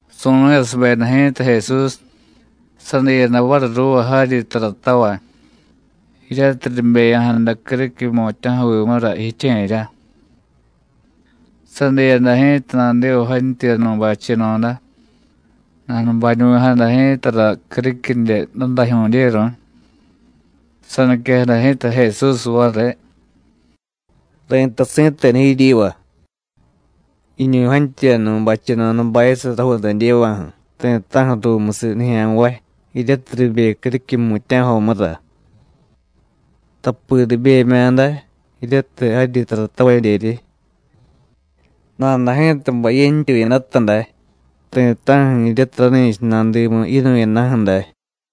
Su̱nu̱yasubeda ji̱ta Jesús, sadiyada variy ruuva jaryi taratavay, jiryatiy ribeya̱jada criquiy jmutya̱jovimura jiche̱rya. Sadiyada ji̱ta nadiva jantyuyanu̱y bacheno̱da, nanubañuvi̱jada ji̱tara criquidye dadajyu̱dyeru̱y. Saniquejada ji̱ta Jesús variy: “Ri̱tay si̱tenu jiryiva: Jiñu̱y jantyuyanu̱y bacheno̱da bayasiy rajuudadyeva̱ju̱ ti̱ta̱ju̱ ruumusiy nijya̱nvay, jiryatiy ribe criquiy jmutya̱jomura. Tapi ribemya̱ day jiryatiy jaryi taratavadyeryi, nada ji̱ta bay yentyuyadata day, ti̱ta̱ju̱ jiryatiy rani̱cha nadimu yinu̱yadaju̱ day.”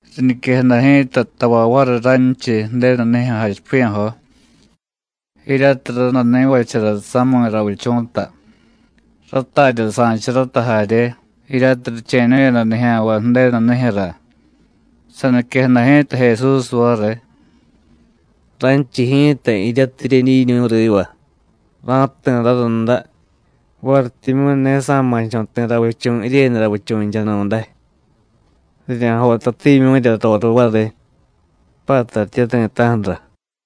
Riñiquejada ji̱ta tavay variy ranchiy Ju̱denu nijyu̱ jachipiya̱jo, jiryatiy randanivachara sami̱ ravichu̱ta, ratarya sa̱charata jarye, jiryatiy riche̱ñu̱yada nijya̱nvay Ju̱denu nijyu̱ra. Saniquejada ji̱ta Jesús variy: “Ranchiy ji̱ta jiryatiy jiryedyiñu̱y riva, ra̱jti̱ rarunda varityimyu̱ ne sa̱ma̱cho̱ ti̱ ravichu̱ jiryenu ravichu̱nchanu̱day. Rirya̱jotatimyu̱rya roriy variy, pattaryitye ti̱ta̱ju̱ra.”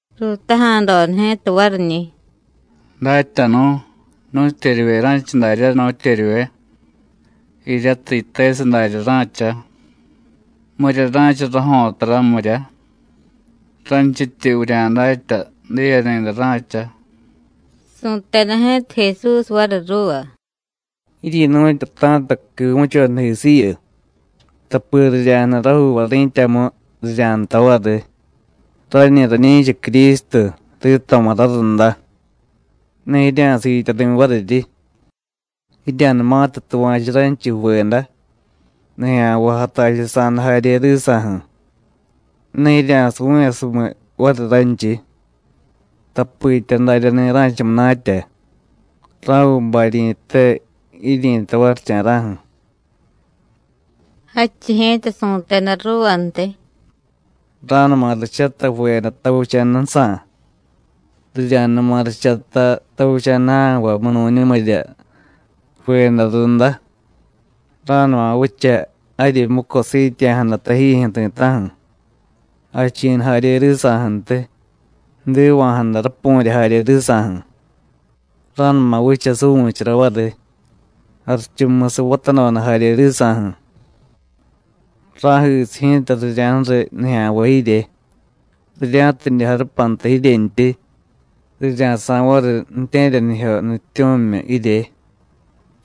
Ruutaja̱doda ji̱ta variñi̱: “Datyanu̱, ¿nu̱tyeryivye ra̱cha daryá, nu̱tyeryivye? jiryatiy yitesiy darya ra̱cha. ¿Mirya ra̱cha rajo̱tara, mirya? ranchityi vurya̱datya: Diye ni̱day ra̱cha.” Su̱teda ji̱ta Jesús variy ruuva: “Jiryi̱nu̱tyata̱ta quivu̱chodajisiyu, tapi rirya̱jniy rajuuvay ri̱tyamu, rirya̱jtay variy: ¡Rañi rañi̱cha Crístu, rito̱ma̱ rarunda! Ne jirya̱siityari̱ variryi. Jirya̱numatiy tuva̱chu ranchiy ju̱veda, nijya̱nvay jatachusa̱da jarye risa̱ju̱, ne jirya̱suvu̱yasumiy variy ranchiy, tapitya daryani̱ ra̱cha munatya. Ra̱viy baryi̱te jiryi̱tay varicha̱ra̱ju̱.” Jadchiy ji̱ta su̱teda ruuvantiy: “Ra̱numa richatay ju̱veda tavicha̱dajsa̱, rirya̱numa richata tavicha̱da ja̱nvay munu̱ñumirya ju̱veda runda. Ra̱numa vicha jaryi muco siityeya̱jada tajijyu̱ ti̱ta̱ju̱, jachi̱nu jarye risa̱ju̱ntiy, jdiva̱jada rapu̱rya jarye risa̱ju̱. Ra̱numa vicha suvu̱chara variy, jarichumusiy vatadoda jarye risa̱ju̱. Ra̱jisiy ji̱ta rirya̱ju̱riy nijya̱nvay jirye, rirya̱tidye jarupanta jiryentyi, rirya̱sa̱y variy ju̱tye̱ryanijyo nutyityu̱mimyu jirye,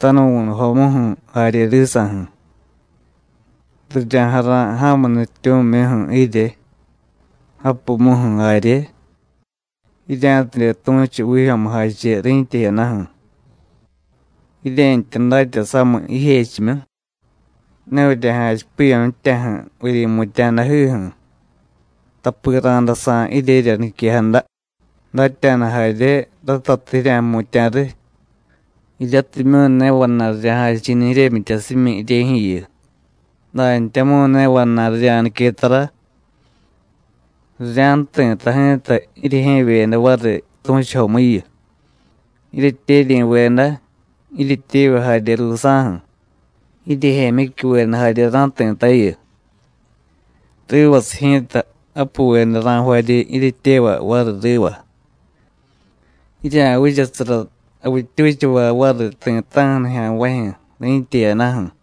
tanuvu̱nujomuju̱ jarye risa̱ju̱. Rirya̱jara̱y ja̱mu nutyityu̱muju̱ jirye, japumuju̱ jarye, jirya̱tidye tu̱chu vijyo̱mujache ri̱tya jiyadaju̱. Jirye̱ntya datya samiy jijechimyu: Ne vurya̱jachipiya̱ ji̱tyaju̱ vuryi̱mutya̱jadajiju̱, tapi ra̱day sa̱y jiryerya niquejada, datya̱da jarye, ratatiy jirya̱jmutya̱ riy, jiryatimyu̱ ne vana̱y rirya̱jachi̱niy jiryemyityasimyi jiryejyu̱yu, dantyamu̱y ne vana̱y rirya̱nique tara. Rirya̱jti̱ta ji̱ta jiryejye̱vyeda variy tu̱chujomuyu, jiryetyeryi̱veda, jiryetyevay jarye ruusa̱ju̱, jiryejemyicyuveda jarye ra̱jti̱tayu. Rivasiy ji̱ta, japuveda ra̱jvaryi jiryetyevay variy riva. Jirya̱vichasara javittyuchavay variy ti̱ta̱ju̱ nijya̱nvajyu̱, ri̱tya jiyadaju̱.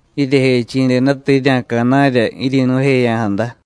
Jiryejechi̱dedata jirya̱ca̱na̱rya jiryi̱nu̱jeya̱jada.”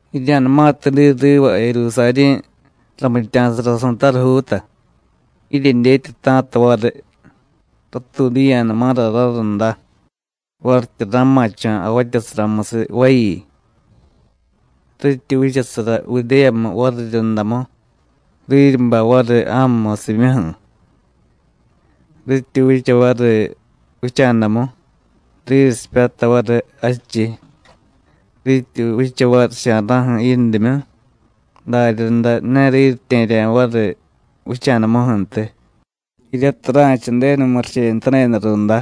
“Jirya̱numatiy diy riva Jerusarí̱ ramitya̱sara su̱tarujuuta, jiryedyetyata̱ta variy: Ratuudiya̱numara rarunda, varityi ra̱ma̱cho̱ javatyasaramusiy vayi. Rityi vichasara Judéyamu variryundamu, riryi bay variy ja̱mu musimyuju̱. Rityi vicha variy vicha̱damu, riryi sipyatay variy jadchiy; rityi vicha varicha̱ra̱ju̱ yindimyu, daryaday, ne riryitye̱rya̱ variy vicha̱damuju̱ntiy, jiryatiy ra̱cha Ju̱denu murichenutadeda runda,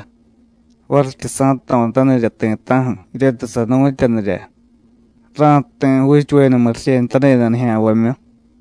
varityi sa̱jto̱tanirya ti̱ta̱ju̱ jiryatiy sanu̱tyanirya: Ra̱jti̱ juuchuveda murichenutadeda nijya̱nvamyu.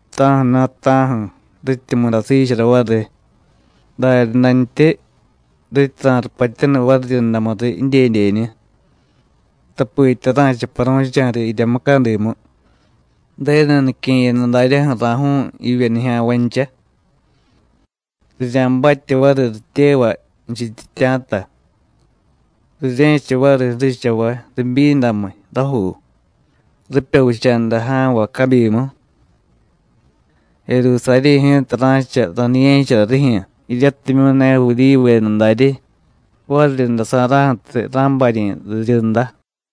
Ta̱ju̱na̱ ta̱ju̱, rityi mudasiichara variy, daryadantyi rityi ra̱rupatyaniy variryundamuriy jidyedyeñu, tapitya ra̱cha paru̱cha̱riy jirya mucadimu, Ju̱denu nique̱yada daryaju̱ ra̱ju̱u̱y jivye nijya̱nvancha. Rirya̱batye variy rityevay jichityitya̱ta, rirye̱cha variy ju̱richavay ribyindamiy rajuu, ripya vicha̱daja̱nvay cabyimu. Jerusarí̱ ji̱ta ra̱cha raniye̱chara rijyu̱ jiryatimyu̱ ne Judíyuveda daryi, variryunda sa̱ra̱ju̱tiy ra̱baryi̱ riryunda.”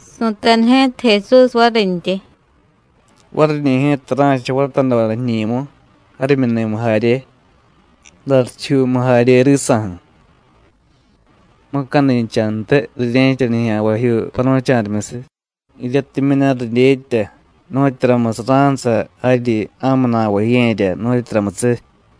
Su̱teda ji̱ta Jesús varintyi: “Variñi̱ ji̱ta ra̱cha vatadoda jiñi̱mu, jarimyuni̱mu jarye, jdarichijyuumu jarye risa̱ju̱; mucadinchantiy rirye̱cha nijya̱nvajyuu paru̱cha̱rimyusiy, jiryatimyu̱ ne ridyetya nu̱tyuramusiy ra̱nsa jaryi ja̱mu na̱va jiye̱rya, nu̱tyuramusiy.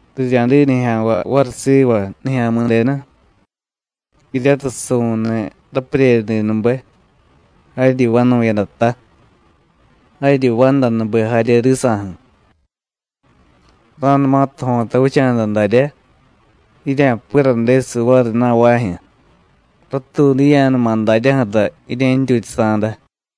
Rirya̱diy nijya̱nvay variy siva Nijya̱mi̱denu, jiryatiy su̱niy rapuryeryadinube, jaryi vanu̱yadata, jaryi vandanube jarye risa̱ju̱. Ra̱numatiy jo̱ta vicha̱da daryá, jirya̱piradesiy variy na̱vajyu̱, ratuudiya̱numa daryaju̱ra jirye̱ntyutyasa̱da.”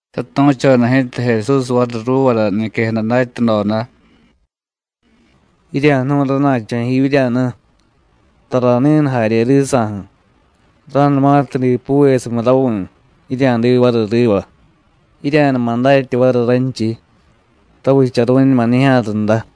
Satu̱choda ji̱ta Jesús variy ruuvara niquejada datyadoda: “Jirya̱jnu̱y rana̱cho̱ jiivyíryanu, tara ni̱nu jarye risa̱ju̱: ra̱numatiy dipuvesumiy ravi̱, jirya̱diy variy riva, jirya̱numa datya variy ranchiy: Ravicharu̱ñuma nijya̱ runda.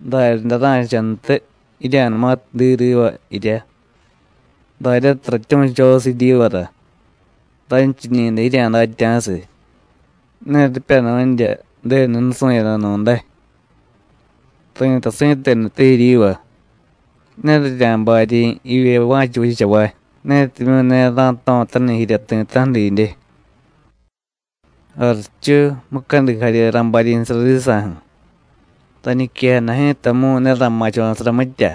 Daryaday ra̱chantiy, jirya̱numatiy diy riva jiryá, daryatiy ratyu̱chosiy jiryivara, ránchiñi̱dáy jirya̱datya̱siy: Ne ripya nu̱nrya Ju̱denu nusu̱yadanu̱day. Ri̱tay si̱tenute jiryiva: Ne rirya̱baryi̱ jivye va̱cha vichavay, netimyu̱ ne ra̱jto̱taniy jirya ti̱ta̱ju̱ didye. Jarichu, mucadi jarye ra̱baryi̱sara risa̱ju̱, rañiquejada ji̱tamu̱y ne ra̱ma̱cho̱sara mitya,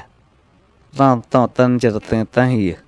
ra̱jto̱tanichara ti̱ta̱ju̱yu.”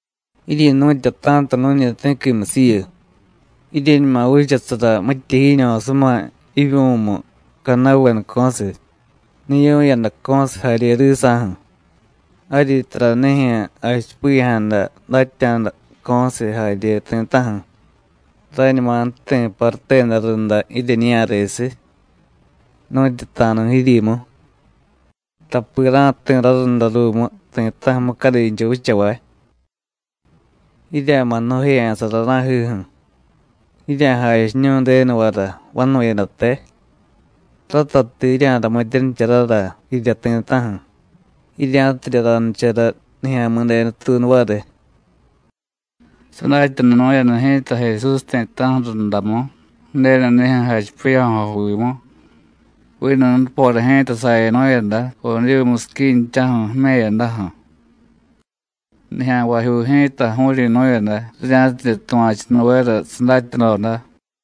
“Jiryi̱nu̱tyata̱ta nu̱ñi ti̱quimusiyu, jiryeñuma vichasara mitya jiiño̱suma jivyu̱mu cadnavedaco̱siy, niyu̱yadaco̱siy jarye risa̱ju̱, jaryi taranijyu̱ jachipiya̱jada datya̱daco̱siy jarye ti̱ta̱ju̱, ráñuma jti̱ paruteda runda jiryeñiya̱resiy, nu̱tyu ta̱a̱nu̱ jiryimu, tapi ra̱jti̱ rarunda ruumu ti̱ta̱ju̱ mucadincha vichavay. Jirya̱ma̱ jnu̱jeya̱sara ra̱jiju̱, jirya̱jachiñu̱y Ju̱denuvara vanu̱yadate, ratatiy jirya̱ramityanicharara jirya ti̱ta̱ju̱, jirya̱tidye ranichara Nijya̱mi̱denu tuunu variy.” Sadatyanunu̱yada ji̱ta Jesús ti̱ta̱ju̱ rundamu Ju̱denu nijyu̱ jachipiya̱jovimu, vinu nupora ji̱ta sayanu̱yada Odivu musiquinchaju̱ jime̱yadaju̱. Nijya̱nvajyuu ji̱ta ju̱u̱ryi̱nu̱yada, rirya̱tidye tuva̱chunuvera sadatyadoda.